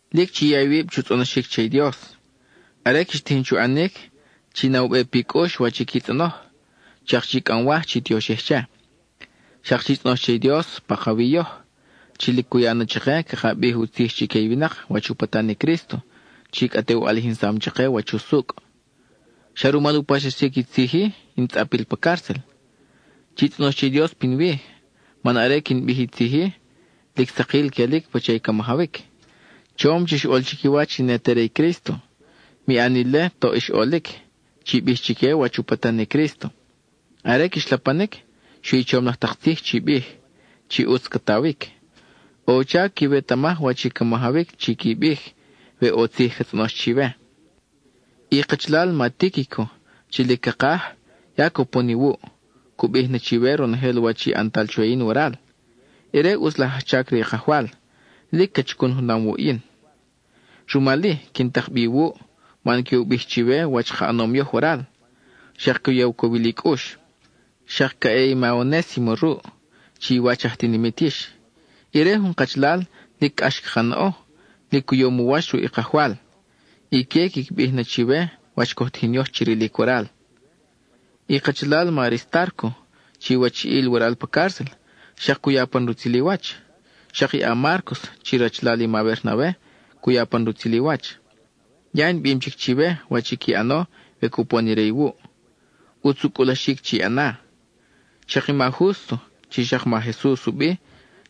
Lic chi ya iwib chu tzʼonoxic che i Dios. Are quix tijin chu ʼanic, chi na u be pi cʼux wach i qui tzʼonoj, xak chi cʼamwaj chi tioxij che. Xak chi tzʼonoj che i Dios pakawi yoj, chi lic cu ya na chake caka bij u tzij chique i winak wach u patan i Crísto, chi cʼa te u ʼalijinsam chake wach usucʼ. Xa rumal u paxsaxic i tzij-i in tzʼapil pa cárcel. Chi tzʼonoj che i Dios pinwi, man are quin bij i tzij-i, lic sakil quelic pacha i ca majawic. Chom chix ʼol chiquiwach i ne te re i Crísto. Mi ʼan ile toʼ ix ʼolic, chi bij chique wach u patan i Crísto. Are quix lapanic, xui i chom laj tak tzij chi bij, chi ʼutz ca tawic. ʼO u chac quiwetamaj wach i ca majawic chi qui bij, we ʼo tzij ca tzʼonox chiwe. I kachalal ma Tíquico chi lic cakaj, ya cupon iwuʼ; cu bij na chiwe ronojel wach i ʼantal chwe yin waral. Ire ʼutz laj ajchac re i Kajwal; lic ca chacun junam wuʼ yin. Rumal-i, quin tak bi iwuʼ, man que u bij chiwe wach ka ʼanom yoj waral, xak que u ya u cowil i cʼux. Xak ca ʼe i ma Onésimo ruʼ, chi iwach aj tinimit yix. Ire jun kachalal, lic cʼax caka naʼo, lic u yom u wach ruʼ i Kajwal. Ique quiqui bij na chiwe wach coj tijin yoj chi rilic waral. I kachalal ma Aristárco chi wachiʼil waral pa cárcel, xak cu ya pan rutzil i wach. Xak i a-Márcos chi rachalal i ma Bernabe cu ya pan rutzil i wach. Ya in bim chic chiwe wach qui ʼano we cupon ire iwuʼ; ʼutz u cʼulaxic chi ʼana. Xak i ma Jústo (chi xak ma Jesus u bi)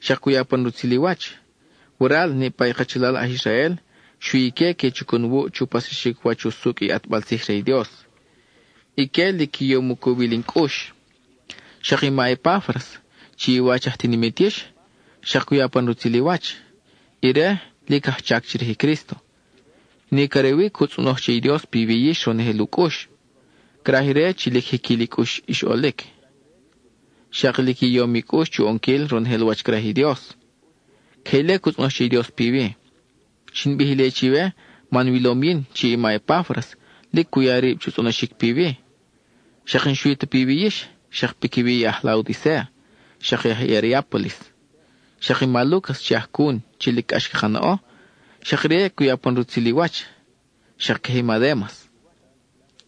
xak cu ya pan rutzil i wach. Waral, niʼpa i kachalal aj Israel, xui ique que chacun wuʼ chu paxsaxic wach usucʼ i ʼatbal tzij re i Dios; ique lic qui yom u cowil in cʼux. Xak i ma Epáfras, chi iwach aj tinimit yix, xak cu ya pan rutzil i wach; ire lic ajchac chirij i Crísto. Nic are wi cu tzʼonoj che i Dios piwi yix ronojel u cʼux. Craj ire chi lic jiquil i cʼux ix ʼolic, xak lic i yom i cʼux chu ʼonquil ronojel wach craj i Dios. Queje ile cu tzʼonoj che i Dios piwi. Xin bij ile chiwe man wilom yin chi i ma Epáfras lic cu ya rib chu tzʼonoxic piwi. Xak n-xui ta piwi yix, xak piquiwi i aj Laodicéa, xak i aj Hierápolis. Xak i ma Lúcas chi ajcun chi lic cʼax caka naʼo, xak ire cu ya pan rutzil i wach, xak queje i ma Démas.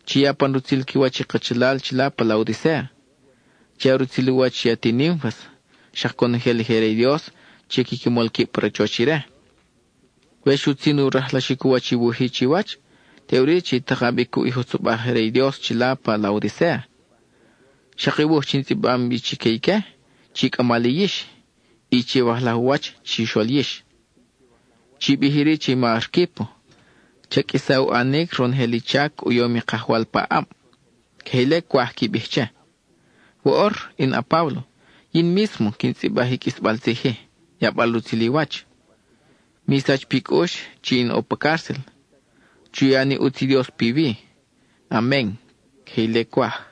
Chi ya pan rutzil qui wach i kachalal chila pa Laodicéa. Chi ya rutzil u wach i ati Nínfas, xak conojel i je re i Dios chi quiqui mol quib pa rachoch ire. We xutzin u rajlaxic u wach i wuj-i chiwach, teʼuri chi taka bi cuʼ i jutzobaj je re i Dios chila pa Laodicéa. Xak i wuj chi in tzʼibam bi chique ique, chi cʼama li yix, y chiwajlaj u wach chixol yix. Chi bij iri che i ma Arquípo: “Cha qʼuisa u ʼanic ronojel i chac u yom i Kajwal paʼab.” Queje ile cwaj qui bij che. Woʼor, in a-Páblo, yin mísmo quin tzʼibaj i qʼuisbal tzij-i, yabal rutzil i wach. Mi sach pi cʼux chi in ʼo pa cárcel. Chu ya ni ʼutz i Dios piwi. Amen (queje ile cwaj).